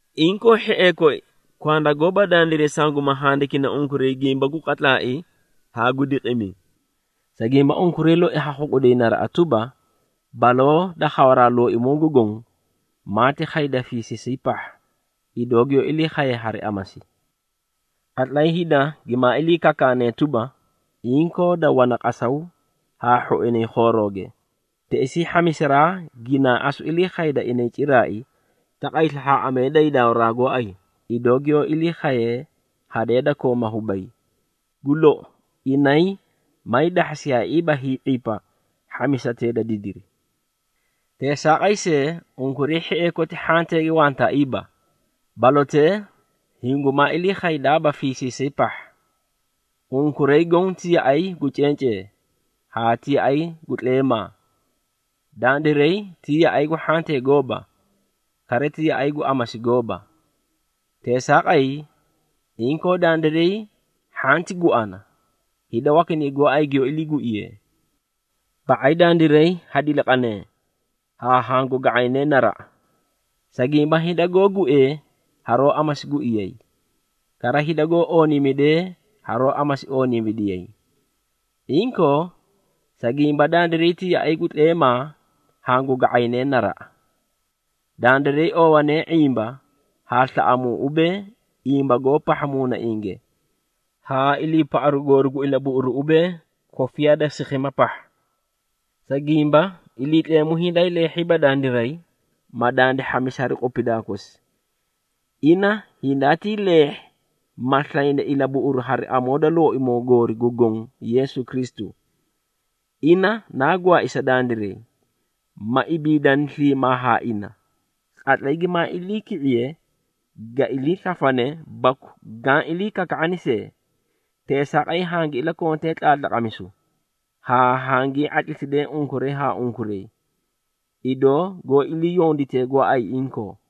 Inkoo, hhiee koi, kwanda gooba dandiray sanguma handikini unkuray gimba gu qatlaai haa gu diqimi. Sa gimba, unkuray loi ha khuꞌuday naraꞌa tuba, baloo da khawaraa Looimoo gu Goõ, maati khayda fiisiisay pahha, idoo giyoó ilii khaye hari amasi. Qatlay hida gimaa ilii kakaanee tuba, “Inkoo, da wana qasaw haa hhoinay khoorooge,” teꞌesii hhamisaraa ginaa asu ilii khayda inay ciraai, taqay slahhaaꞌamee da hiidawaraa gooay, idoo giyoó ilii khayee hadee da kooma hubay. Gu lou, inay maay dahhasiyaaiiba hii⁄ipa hhamisatee da didiri. Teesaaqay see, unkuray hhiee koti hhanteege wantaaiiba, balotee hingumaa ilii khaydaaba fiisiisay pahha. Unkuray goõ ti yaꞌay gu cencee haa ti yaꞌay gu tleemaa. Dandiray ti yaꞌay gu hhantee gooba, kara ti yaꞌay gu amasi gooba. Teesaaqay, inkoo dandiray hhanti guana, hida wakinay gooay giyoó iliiguiyee. Ba⁄ay dandiray ha diliqanee haa hangu ga⁄aynee naraꞌa. Sa gimba, hida goó guee haroó amasi guiyay, kara hida goó ooniimidee haroó amasi ooniimidiyay. Inkoo, sa gimba dandiray ti yaꞌay gu tleemaa hangu ga⁄ayne naraꞌa. Dandiray oowanee ⁄imba haa slaꞌamuu ubee, imbagoo pahha muunainge, haa iliipaꞌaru goori gu ilabuꞌuru ubee, kofiyaa da sikhima pahha. Sa gimba, Iliitleemu hindaay leehhiiba dandiray, ma dandi hhamisi hari qupidaa kosi. Ina hindaatii leehhi, ma slayni ilabuꞌuru hari amoo da Looimoo goori gu Goõ Yeesu Kristu. Ina naa gwaai sa dandiray, ma ibiidani sliimaa haa ina, qatlay gimaa iliiki⁄iye, ga ilii slafane baku gaã ilii kaka⁄ani see. Teesaaqay, hangi ilakontee tlaatlaqamisu, haa hangii ⁄atlimisidee unkuray haa unkuray, idoo goó iliiyonditee gooay inkoo.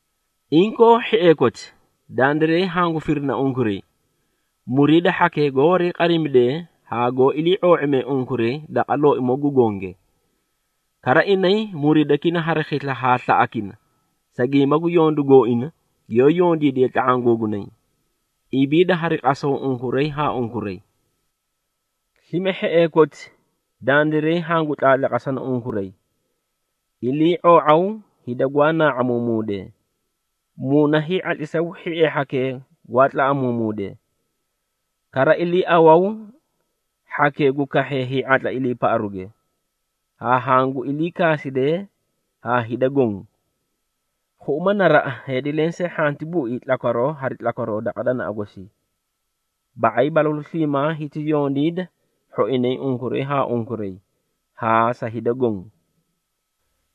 Inkoo hhiee koti, dandiray hangu firina unkuray, muriida hhakee goó wariiqadimidee haa goó ilii⁄oo⁄imee unkuray daqa Looimoo gu Gonge. Kara, inay muriidakina hari khisla haa slaꞌakina, sa gimba gu yondu gooina, giyoó yondiidiyee tla⁄aã googunay. Ibiida hari qasaw unkuray haa unkuray. Slime hhiee koti, dandiray hangu tlaatlaqasana unkuray, ilii⁄oo⁄aw hida gwaa naa⁄amuumuudee. Muuna hii⁄atlisaw hhiee hhakee gwaa tlaꞌamuumuudee. Kara, iliiawaw hhakee gu kahhee hii⁄atla iliipaꞌaruuge, haa hangu iliikaasidee haa hida goõ. Khuꞌuma naraꞌa, heedi lensee hhanti bui tlakwaroo hari tlakwaroo daqa danaꞌa gosii. Ba⁄ay balalu sliimaa hiti yondiida hhoinay unkuray haa unkuray, haa sa hida goõ.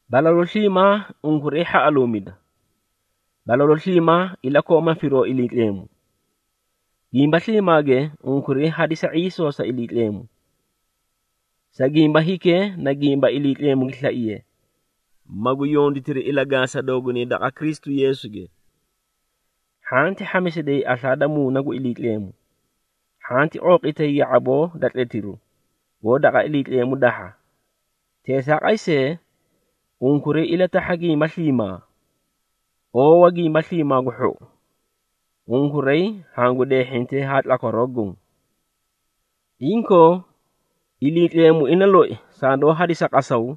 Balalu sliimaa unkuray hhaꞌaluumida. Balalu sliimaa ilakooma firoo Iliitleemu. Gimba sliimaage unkuray hadisa ⁄iisoo sa Iliitleemu. Sa gimba hikee na gimba Iliitleemu gi slaiye, magu yonditiri ilagaasa doogunay daqa Kristu Yeesuge. Hhanti hhamisiday aslaa da Muuna gu Iliitleemu. Hhanti qooqitay ya⁄aboo da tletiru, goó daqa Iliitleemu dahha. Teesaaqay see, unkuray ilatahha gimba sliimaa. Oowa gimba sliimaa gu hhou. Unkuray hangu deehhintee haa tlakwaroo goõ. Inkoo, Iliitleemu ina loi sandoó hadisa qasaw,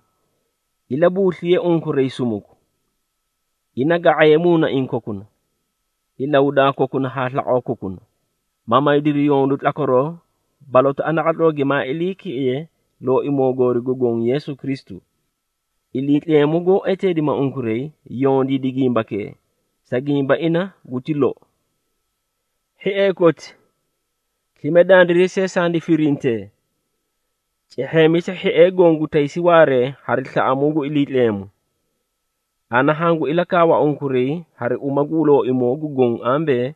ilabuusliye unkuray sumuku. Ina ga⁄aye muunaiĩ kokuna, ilahudaa kokuna haa slaqoo kokuna, ma maydiri yondu tlakwaroo balotaꞌa naqatloo gimaa iliiki⁄iye Looimoo goori gu Goõ Yeesu Kristu. Iliitleemu goó eteedima unkuray, yondiidi gimbakee, sa gimba ina guti lou. Hhiee koti, slime dandiray see sandi firintee. Cehheemisa hhiee goõ gu taysi waaree hari slaꞌamuu gu Iliitleemu. Ana hangu ilakaawa unkuray hari uma gu Looimoo gu Goõ ambee,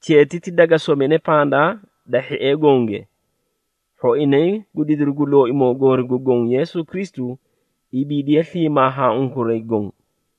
cheetiti daga somine pandaa da hhiee gonge. Hhoinay gu didiru gu Looimoo goori gu Goõ Yeesu Kristu ibiidiye sliimaa haa unkuray goõ.